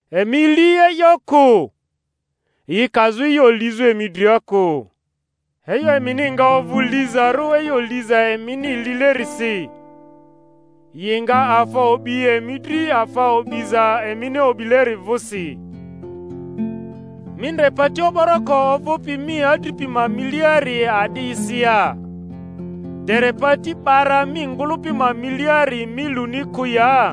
Emi li e'yo kᴜ, yi kazᴜ e'yo lizᴜ emi dria kᴜ. E'yo emini nga ovᴜ lizarᴜ e'yo liza emini lilerisi, yi nga afa o'bi emi dri afa o'biza emini o'bileri vᴜsi. Mi ndre pati o'boroko ovᴜpi mi adripi ma miliari a'disi ya, dere pati 'bara mi ngᴜlᴜpi ma miliari mi luni kᴜ ya?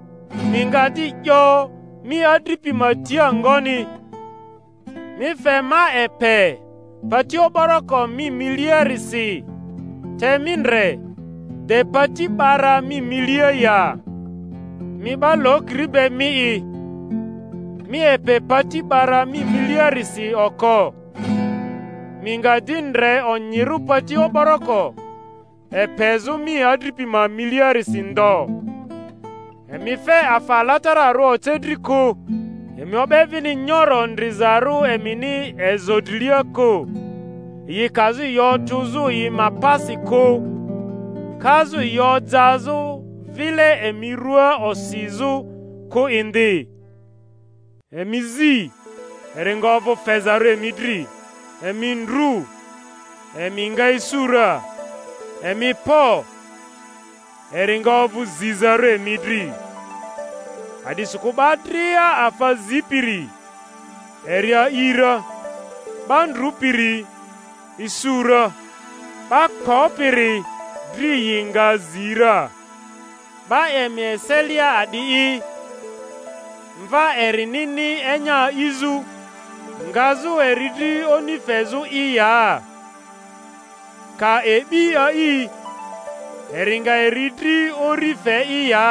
Mi nga di 'yo mi adripi ma tia ngoni, Mi fe ma epe pati o'boroko mi miliarisi; te mi ndre, de pati 'bara mi milia ya? Mi 'ba lokiri be mi'i, mi epe pati 'bara mi miliarisi oko; mi nga di ndre onyirᴜ pati o'boroko epezᴜ mi adripi ma miliarisi ndo. Emi fe afa alatararᴜ oce dri kᴜ; emi o'be vini nyoro ndrizarᴜ emini ezo drilia kᴜ, yi kazᴜ yi otᴜzᴜ yi ma pasi kᴜ, kazᴜ yi ojazᴜ vile emi rua osizᴜ kᴜ indi. Emi zi, eri nga ovᴜ fezarᴜ emi dri; emi ndru, emi nga isu ra; emi kpo, eri nga ovᴜ zizarᴜ emi dri. A'disikᴜ 'ba dria afa zipiri, eri a'i ra; 'ba ndrupiri isu ra; 'ba kpopiri dri yi nga zi ra. 'Ba emi eselia a'di'i, mva erinini enya a'izᴜ, ngazᴜ eri dri oni fezᴜ'i ya? Ka e'bi a'i, eri nga eri dri uri fe'i ya?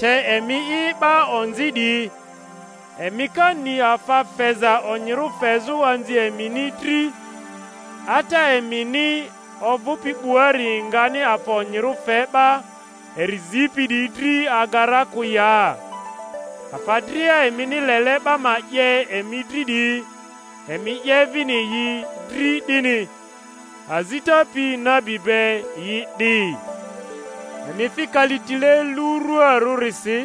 Te emi'i 'ba onzi 'diyi, emi ka ni afa feza onyirᴜ fezᴜ anzi emini dri, Ata emini ovᴜpi 'buari ngani afa onyirᴜ fe 'ba eri zipi 'diyi dri aga ra kᴜ ya? Afa dria emini lele 'ba ma 'ye emi dri 'diyi, emi 'ye vini yi dri 'dini; azita pi nabi be yi 'di. Emi fi kalitile luruarᴜrisi;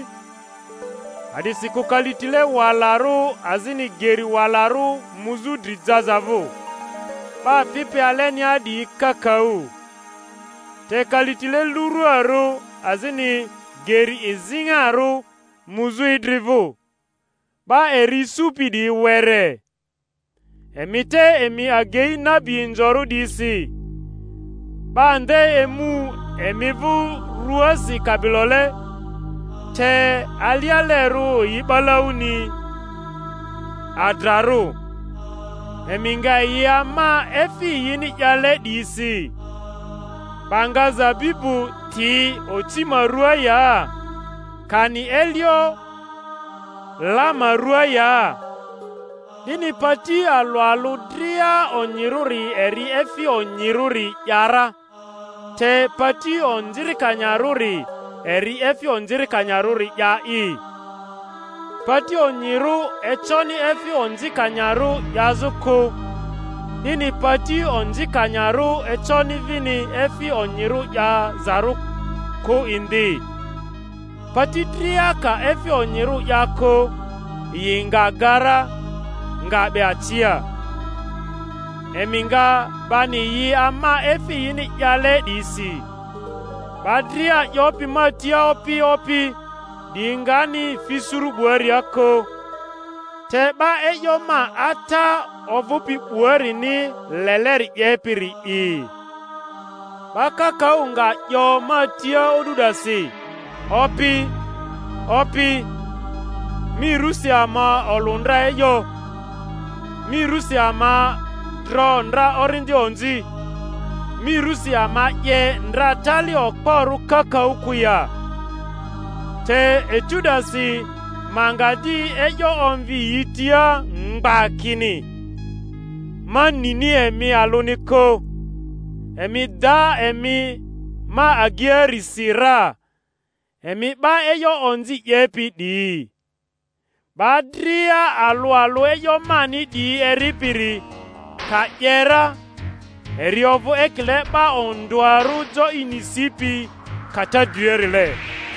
a'disikᴜ kalitile walarᴜ azini geri walarᴜ muzᴜ dri jaza vᴜ, 'ba fipi alenia 'diyi kakaᴜ. Te kalitile lurᴜarᴜ azini geri iziŋarᴜ muzᴜ idri vᴜ, 'ba eri isupi 'diyi were. Emi te emi agei nabi inzorᴜ 'diyisi; 'ba nde emu emi vᴜ rᴜasi kabilole, te alialerᴜ yi 'balauni adrarᴜ. Emi nga yi ama, efi yini 'yale 'diyisi. 'Ba nga zabibu ti oci ma rᴜaa ya? Kani elio la ma ruaa ya? 'Dini pati alᴜ alᴜ dria onyirᴜri eri efi onyirᴜri 'ya ra, te pati onzikanyarᴜri eri efi onzikanyarᴜri 'ya'i. Pati onyirᴜ econi efi onzikanyarᴜ 'yazᴜ kᴜ, 'dini pati onzikanyarᴜ econi vini efi onyirᴜ 'yazarᴜ kᴜ indi. Pati dria ka efi onyirᴜ 'ya kᴜ, yi nga ga ra, nga 'be acia. Emi nga bani yi ama efi yini 'yale 'diyisi. 'Ba dria 'yopi ma tia, Opi, Opi, 'diyi ngani fi suru 'buaria kᴜ, te 'ba e'yo ma Ata ovᴜpi 'buarini leleri 'yepiri'i. 'Ba kakaᴜ nga 'yo ma tia o'du 'dasi, Opi, Opi, mi rusi ama olᴜ ndra e'yo, mi rᴜsi ama dro ndra orindi onzi, mi rusi ama 'ye ndra tali okporᴜ kakaᴜ kᴜ ya? Te etu 'dasi ma nga di e'yo omvi yi tia mgba kini, Ma nini emi alᴜni kᴜ; emi da emi ma ageiarisi ra, emi 'ba e'yo onzi 'yepi 'diyi. 'Ba dria alᴜ alᴜ e'yo mani 'diyi eripiri, ka 'ye ra, eri ovᴜ ekile 'ba ondᴜarᴜ jo ini sipi kata driarile;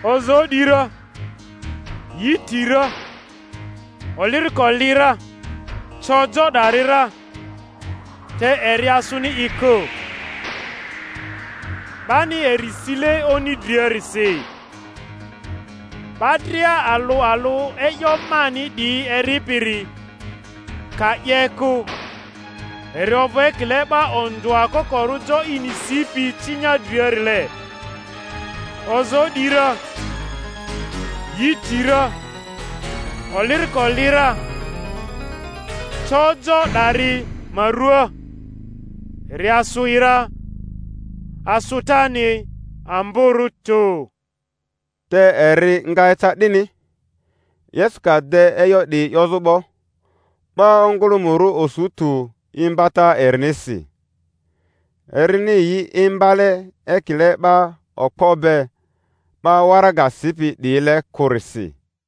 ozoo 'di ra, yi ti ra, oliriko li ra, co jo 'dari ra, te eri asᴜni i kᴜ, 'bani eri sile oni driarisi. 'Ba dria alᴜ alᴜ e'yo mani 'diyi eripiri, ka 'ye kᴜ, eri ovᴜ ekile 'ba ondᴜa kokorᴜ jo ini sipi cinya driarile; ozoo 'di ra, yi ti ra, oliriko li ra, co jo 'dari ma rᴜa, eri asᴜ i ra; asᴜtani amborᴜ tᴜ. Te eri nga eca 'dini, Yesu ka de e'yo 'diyi 'yozᴜ 'bo, 'ba ongᴜlᴜmᴜrᴜ osu tᴜ imbata erinisi, erini yi imbale ekile 'ba okpo be, 'ba waraga sipi 'diyile kᴜrisi.